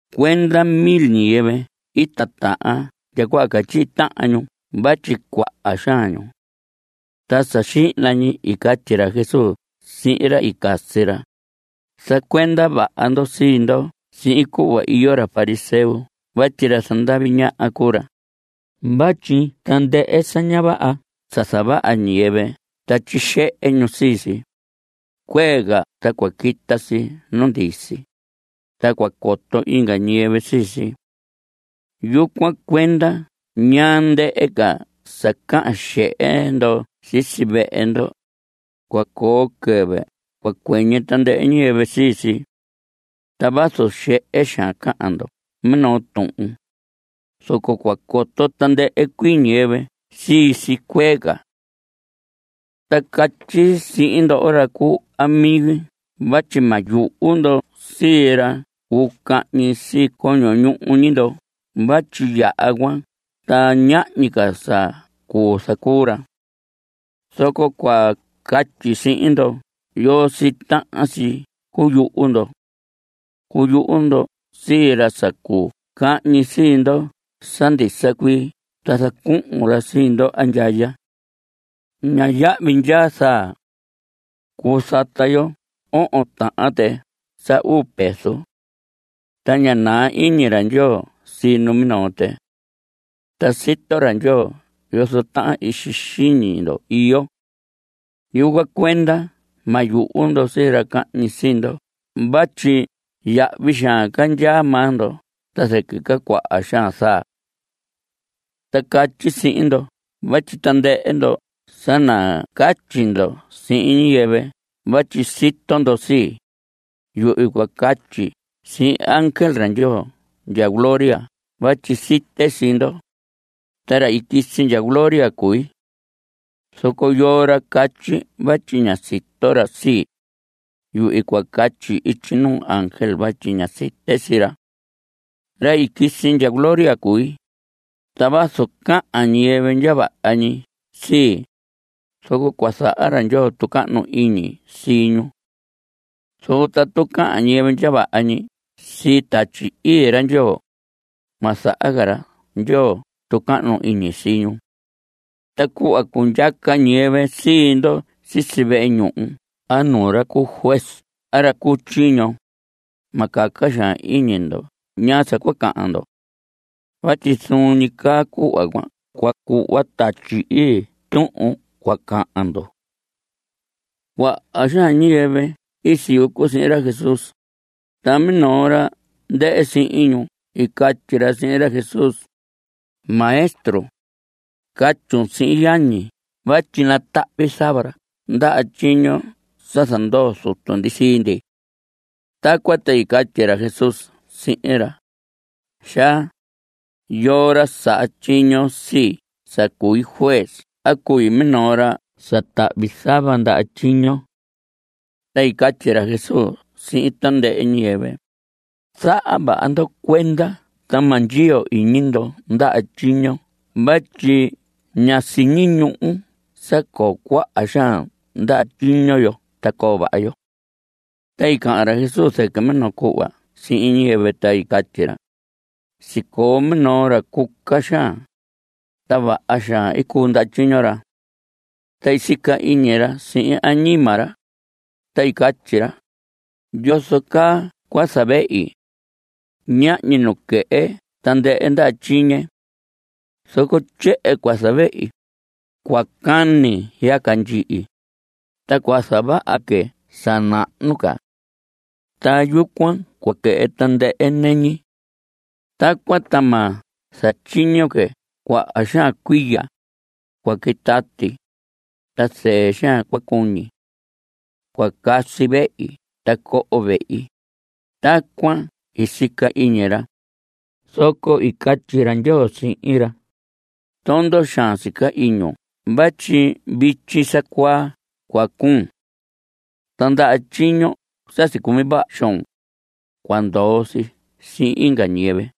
Cuenda mil ñiyɨvɨ i titahan ndya cuhva catyihi tahan ñu vatyi cuaha xaan ñu. Ta sa xihna ñi i catyi ra Jesús sihin ra i casi ra: Zacuenda vaha ndo sii ndo sihin cuhva iyo ra fariseo vatyi ra zandavi ñaha cuu ra. Vatyi tandɨhɨ sa ña vaha sa zavaha ñiyɨvɨ ta tyixehe ñu sii si, cuee ca ta cua quita si nu ndisi, ta cua coto inga ñiyɨvɨ sii si. Yucuan cuenda ñaa ndɨhɨ ca sa cahan xehe ndo sisi vehe ndo, cua coo quɨvɨ cua cuɨñɨ tandɨhɨ ñiyɨvɨ sii si. Ta vazu xehe xaan cahan ndo minoo tuhun, zoco cua coto tandɨhɨ cuii ñiyɨvɨ sii si cuee ca. Ta catyi sihin ndoho ra cuu amigi vatyi ma yuhu ndo sii ra cuu cahñi sii coño ñuhu ñi ndo vatyi yaha cuan ta ñahñi ca sa cuu zacuu ra. Zoco cua catyi sihin ndo yoo sii tahan si cuyuhu ndo. Cuyuhu ndo sii ra sa cuu cahñi sii ndo sa ndisa cuii ta zacuhun ra sii ndo andyaya. Ña yahvi ndyaa zaa. Cuu zata yo ohon tahan tɨ sa uu peso. Ta ña naa iñi ra Ndyoo sii numinoo tɨ. Ta sito ra Ndyoo yozo tahan ixi xiñi ndo iyo. Yucuan cuenda ma yuhu ndo sii ra cahñi sii ndo vatyi yahvi xaan ca ndyaa maa ndo ta zɨquɨ ca cuaha xaan zaa. Ta catyi sihin ndo vatyi tandɨhɨ ndo sa nacatyi ndo sihin ñiyɨvɨ vatyi sito ndo sii, yuhvi cua catyi sihin ángel ra Ndyoo ndya gloria vatyi site sii ndo. Ta ra i quisi ndya gloria cui. Zoco yoo ra catyi vatyi ña sito ra sii, yuhvi cua catyi ityi nuu ángel vatyi ña site sii ra. Ra i quisi ndya gloria cui, ta vazu cahan ñiyɨvɨ ndya vaha ñi sii, zoco cua zaha ra Ndyoo tucahnu iñi sii ñu. Zoco tatu cahan ñiyɨvɨ ndya vaha ñi sii Tatyi Ii ra Ndyoo, ma zaha ca ra Ndyoo tucahnu iñi sii ñu. Ta cuhva cundyaca ñiyɨvɨ sii ndo sisi vehe ñuhu a nuu ra cu juez a ra cu tyiño, ma caca xaan iñi ndo ñaa sa cua cahan ndo. Vatyi zuun ñi caa cuhva cuan cua cuhva Tatyi Ii tuhun cua cahan ndo. Cuaha xaan ñiyɨvɨ i siyucu sihin ra Jesús, ta minoo ra ndɨhɨ sihin ñu i catyi ra sihin ra Jesús: Maestro, catyun sihin yañi vatyi natahvi zava ra ndaha tyiño sa zandoo zutu ndi sii ndi. Tacuan ta i catyi ra Jesús sihin ra: Xaa, ¿yoo ra saha tyiño sii sa cui juez a cui minoo ra sa tahvi zava ndaha tyiño? Ta i catyi ra Jesús sihin tandɨhɨ ñiyɨvɨ: Zaha vaha ndo cuenda ta ma ndyiyo iñi ndo ndaha tyiño vatyi ña siñi ñuhu sa coo cuaha xaan ndaha tyiño yo ta coo vaha yo. Ta i cahan ra Jesús zɨquɨ minoo cuhva sihin ñiyɨvɨ, ta i catyi ra: Sicoo minoo ra cuca xaan, ta vaha xaan i cuu ndaha tyiño ra. Ta i sica iñi ra sihin añima ra, ta i catyi ra: “¿Yozo caa cua zavehi? Ñahñi nu quɨhɨ tandɨhɨ ndaha tyiñe. Zoco tyehen cua zavehi. Cua cani yaca ndyihi, ta cua zavaha que sa nahnu ca. Ta yucuan cua quɨhɨ tandɨhɨ nɨñi. Tacuan ta ma zatyiño que cuaha xaan cuiya. Cua quitati, ta zɨɨ xaan cua cuñi. Cua casi vehi ta coho vehi.” Tacuan i sica iñi ra. Zoco i catyi ra Ndyoo sihin ra: “Tondo xaan sica iñun vatyi vityi sa cuaa cua cuun. Ta ndaha tyiño sa sicumi vaha xoon, cua ndoo si sihin inga ñiyɨvɨ.”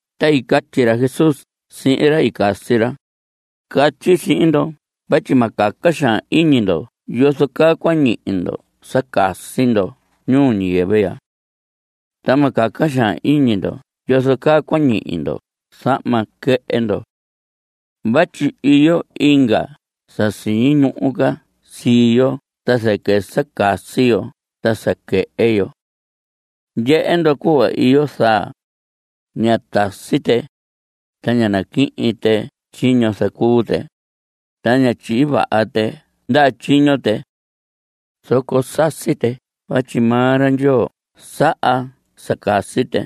Ta i catyi ra Jesús sihin ra i casi ra: Catyi sihin ndo vatyi ma caca xaan iñi ndo yozo caa cua ñihi ndo sa casi ndo ñuu ñiyɨvɨ ya. Ta ma caca xaan iñi ndo yozo caa cua ñihi ndo zahma quɨhɨ ndo. Vatyi iyo inga sa siñi ñuhu ca sii yo ta zɨquɨ sa casi yo ta sa quɨhɨ yo. Ndyehe ndo cuhva iyo zaa. Ña tasi tɨ, ta ña naquihin tɨ tyiño zacuu tɨ, ta ña tyihi vaha tɨ ndaha tyiño tɨ. Zoco sasi tɨ vatyi maa ra Ndyoo saha sa casi tɨ.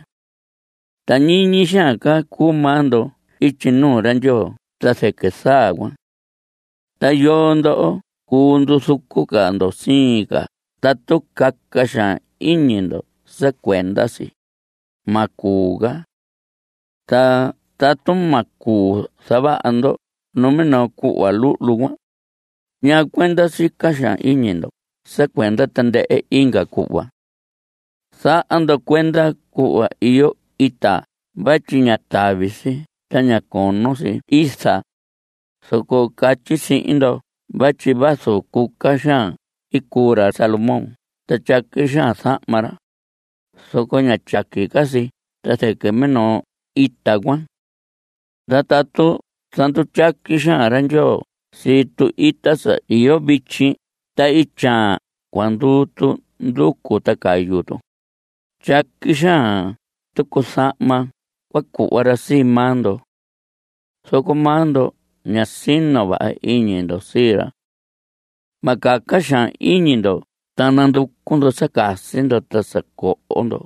Ta ñiñi xaan ca cuu maa ndo ityi nuu ra Ndyoo ta zɨquɨ zaa cuan. ¿Ta yoo ndo cuu nduzucu ca ndo siin ca tatu caca xaan iñi ndo sa cuenda si? Ma cuu ca. Ta tatu ma cuu zavaha ndo numinoo cuhva luhlu cuan, ¿ñaa cuenda sica xaan iñi ndo sa cuenda tandɨhɨ inga cuhva? Zaha ndo cuenda cuhva iyo ita vatyi ña tavi si ta ña cono si iza, zoco catyi sihin ndo vatyi vazu cuca xaan i cuu ra Salomón ta tyaqui xaan zahma ra, zoco ña tyaqui ca si ta zɨquɨ minoo ita cuan. Ta tatu zandutyaqui xaan ra Ndyoo sii tu‑ita sa iyo vityi ta ityaan cua nduu tu nducu ta cayu tu, tyaqui xaan tucu zahma cua cuhva ra sii maa ndo. Zoco maa ndo ña sino vaha iñi ndo sii ra. Ma caca xaan iñi ndo ta nanducu ndo sa casi ndo ta sa coho ndo.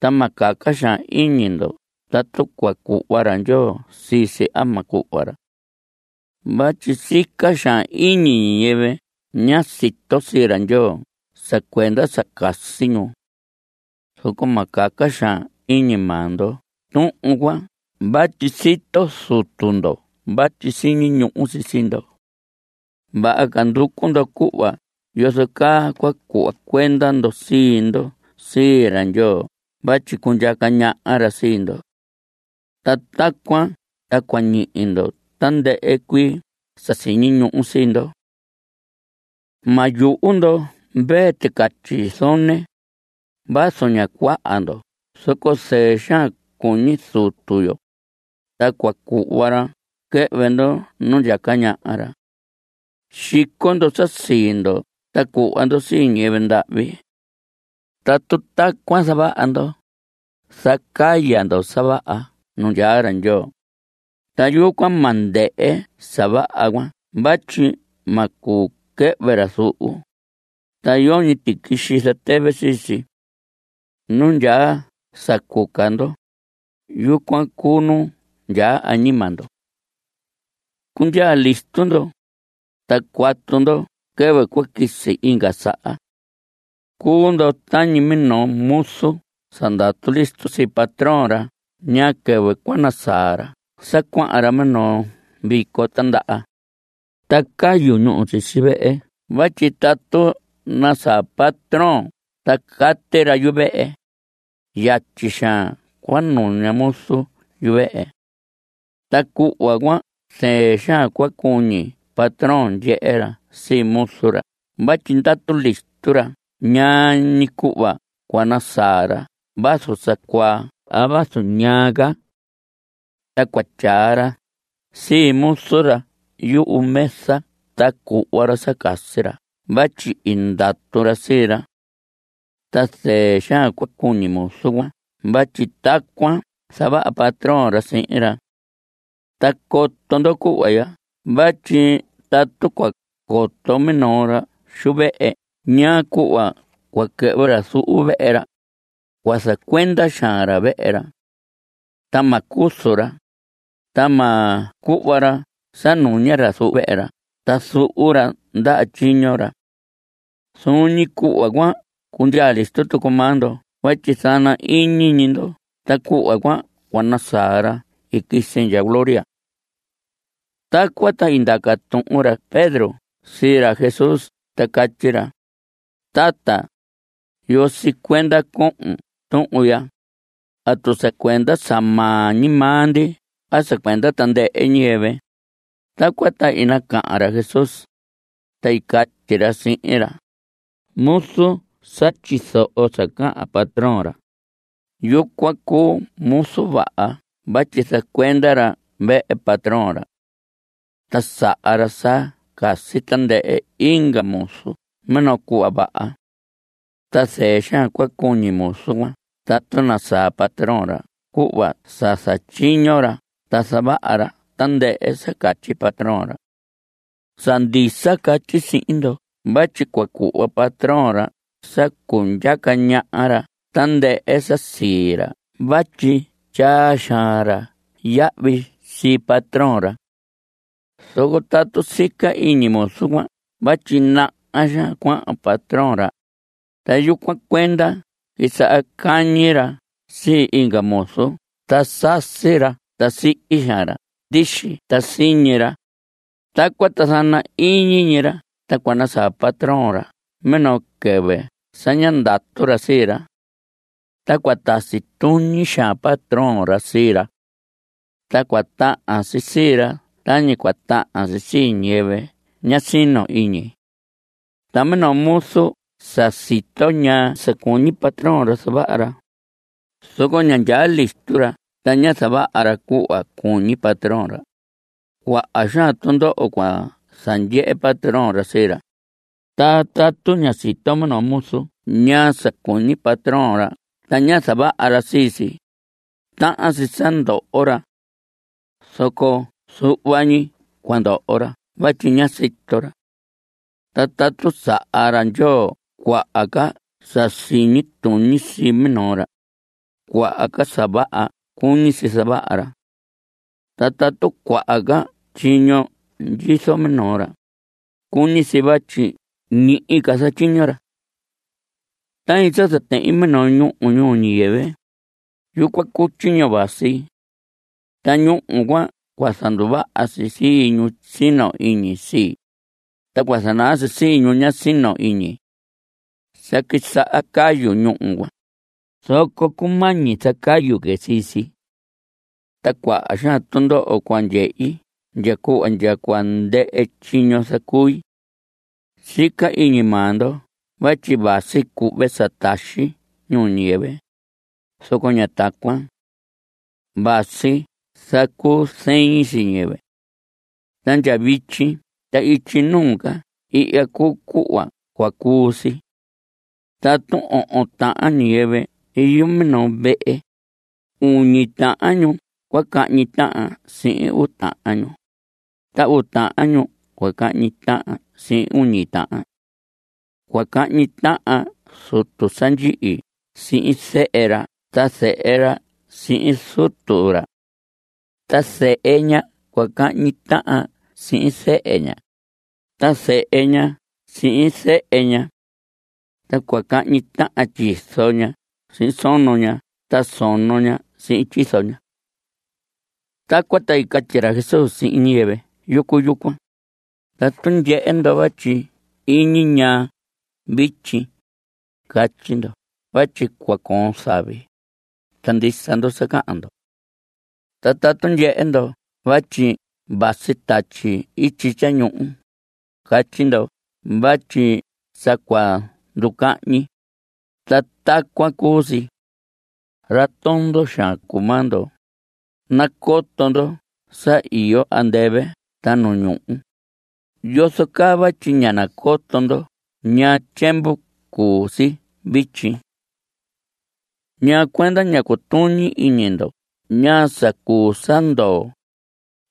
Ta ma caca xaan iñi ndo tatu cua cuhva ra Ndyoo sii si a ma cuhva ra. Vatyi sica xaan iñi ñiyɨvɨ ña sito sii ra Ndyoo sa cuenda sa casi ñu. Zoco ma caca xaan iñi maa ndo tuhun cuan vatyi sito Zutu ndo vatyi siñi ñuhu si sii ndo. Vaha ca nducu ndo cuhva yozo caa cua cuhva cuenda ndo sii ndo sii ra Ndyoo vatyi cundyaca ñaha ra sii ndo. Ta tacuan ta cua ñihi ñdo tandɨhɨ cuii sa siñi ñuhu sii ndo. Ma yuhu ndo, mvee ticatyi zone. Vazu ña cuaha ndo zoco zɨɨ xaan cuñi Zutu yo, ta cua cuhva ra quɨhvɨ ndo nu ndyaca ñaha ra. Xico ndo sa sii ndo ta cuhva ndo sii ñiyɨvɨ ndahvi. Tatu tacuan zavaha ndo, zacaya ndo sa vaha nu ndyaa ra Ndyoo. Ta yucuan ma ndɨhɨ sa vaha cuan vatyi ma cuu quɨhvɨ ra zuhu, ta yoñi tiquixi zatɨvɨ sii si. Nu ndyaa sa cuca ndo, yucuan cuu nu ndyaa añima ndo. Cundyaa listo ndo, ta cuatu ndo quɨvɨ cua quisi inga saha. Cuu ndo tañi minoo muzu sa ndatu listo sii patrón ra ñaa quɨvɨ cua nasaa ra sa cuahan ra minoo vico tindaha. Ta cayu ñúhu sisi vehe vatyi tatu nasaa patrón ta cati ra yuvehe, yatyi xaan cua nuña muzu yuvehe. Ta cuhva cuan zɨɨ xaan cua cuñi patrón ndyehe ra sii muzu ra vatyi ndatu listo ra ñaa ñi cuhva cua nasaa ra vazu sa cuaa a vazu ñaa ca. Ta cua tyaa ra sii muzu ra yumesa ta cuhva ra sa casi ra vatyi i ndatu ra sii ra. Ta zɨɨ xaan cua cuñi muzu cuan vatyi tacuan zavaha patrón ra sihin ra. Ta coto ndo cuhva ya vatyi tatu cua coto minoo ra xu vehe ñaa cuhva cua quɨhvɨ ra zuhu vehe ra, cua zacuenda xaan ra vehe ra. Ta ma cuzu ra. Ta ma cuhva ra sa nuña ra zuhu vehe ra ta zuhu ra ndaha tyiño ra. Zuun ñi cuhva cuan cundyaa listo tucu maa ndo vatyi zana ñi iñi ndo ta cuhva cuan cua nasaa ra i quisi ndya gloria. Tacuan ta i ndaca tuhun ra Pedro sii ra Jesús ta catyi ra: Tata, ¿Yoo sii cuenda cohon tuhun ya? ¿Atu sa cuenda sa maa ñi maa ndi a sa cuenda tandɨhɨ ñiyɨvɨ? Tacuan ta i nacahan ra Jesús, ta i catyi ra sihin ra: Muzu sa tyizoho sa cahan patrón ra, yucuan cuu muzu vaha vatyi zacuenda ra vehe patrón ra. Ta saha ra sa casi tandɨhɨ inga muzu minoo cuhva vaha. Ta zɨɨ xaan cua cuñi muzu cuan tatu nasaa patrón ra cuhva sa zatyiño ra ta zavaha ra tandɨhɨ sa catyi patrón ra. Sa ndisa catyi sihin ndo vatyi cua cuhva patrón ra sa cundyaca ñaha ra tandɨhɨ sa sii ra vatyi tyaa xaan ra yahvi sii patrón ra. Zoco tatu sica iñi muzu cuan vatyi naha xaan cuahan patrón ra, ta yucuan cuenda quisaha cañi ra sii inga muzu ta sasi cuahyi ra ta sihi xaan ra ndixi ta siñi ra, tacuan ta zana ñi iñi ra ta cua nasaa patrón ra minoo quɨvɨ sa ña ndatu ra sii ra. Ta cua tasi tuñi xaan patrón ra sii ra. Ta cua tahan si sii ra tañi cua tahan si sii ñiyɨvɨ ña sino iñi. Ta minoo muzu sa sito ñaa sa cuñi patrón ra zavaha ra, zoco ña ndyaa listo ra ta ña zavaha ra cuhva cuñi patrón ra, cuaha xaan tundoho cua zandyehe patrón ra sii ra. Ta tatu ña sito minoo muzu ñaa sa cuñi patrón ra ta ña zavaha ra sii si, tahan si sa ndoho ra. Zoco zuhva ñi cua ndoho ra vatyi ña sito ra. Ta tatu saha ra Ndyoo cuaha ca sa siñi tuñi sii minoo ra, cuaha ca sa vaha cuñi si zavaha ra. Ta tatu cuaha ca tyiño ndyizo minoo ra, cuñi si vatyi ñihi ca zatyiño ra. Tañi sa zatehin minoo ñúhu ñuu ñiyɨvɨ, yucuan cuu tyiño vasi. Ta ñúhu cuan cua zanduvaha si sii ñu sino iñi sii, ta cua zanaa si sii ñu ña sino iñi. Sa quisaha cayu ñúhu cuan, zoco cumañi zacayu que sii si. Ta cuaha xaan tundoho cua ndyehi ndya cuhva ndya cua ndɨhɨ tyiño zacui. Sica iñi maa ndo vatyi vasi cuhve sa taxi ñuu ñiyɨvɨ, zoco ña tacuan. Vasi zacuzɨin sii ñiyɨvɨ. Ta ndya vityi ta ityi nuu ca ihya cuu cuhva cua cuu si. Tatu ohon tahan ñiyɨvɨ iyo minoo vehe, uñi tahan ñu cua cahñi tahan sihin uu tahan ñu, ta uu tahan ñu cua cahñi tahan sihin uñi tahan. Cua cahñi tahan zutu sa ndyihi sihin zehe ra ta zehe ra sihin zutu ra. Ta zɨhɨ ña cua cahñi tahan sihin zehe ña, ta zehe ña sihin zɨhɨ ña. Ta cua cahñi tahan tyizo ña sihin sono ña ta sono ña sihin tyizo ña. Tacuan ta i catyi ra Jesús sihin ñiyɨvɨ yucu yucuan: Tatu ndyehe ndo vatyi iñi ñaa vityi, catyi ndo vatyi cua coon zavi. Ta ndisa ndo sa cahan ndo. Ta tatu ndyehe ndo vatyi vasi tatyi ityi tyañuhu, catyi ndo vatyi sa cua ndu‑cahñi. Ta tacuan cuu si. Ra tondo xaan cuu maa ndo. Nacoto ndo sa iyo andɨvɨ ta nu ñuhu. ¿Yozo caa vatyi ña nacoto ndo ñaa tyiemvu cuu si vityi? ¿Ñaa cuenda ña cutuñi iñi ndo ñaa sa cuu sa ndoo?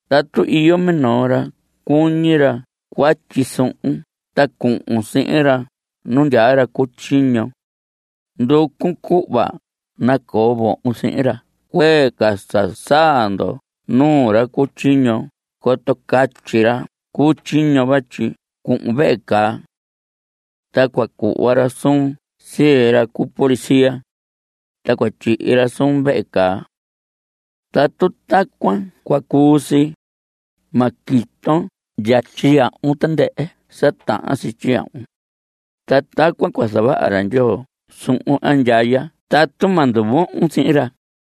Tatu iyo minoo ra cuñi ra cuatyi suhun ta cuhun sihin ra nu ndyaa ra cu tyiño, nducun cuhva nacoo vohon sihin ra cuee ca sa saa ndo nuu ra cu tyiño coto catyi ra cu tyiño vatyi cuhun vehe caa. Ta cua cuhva ra suun sii ra cu policía. Ta cua tyihi ra suun vehe caa. Tatu tacuan cua cuu si, ma quiton ndya tyiyahvun tandɨhɨ sa tahan si tyiyahvun, (ta tacuan cua zavaha ra Ndyoo suhun andyaya tatu ma nduvohon sihin ra).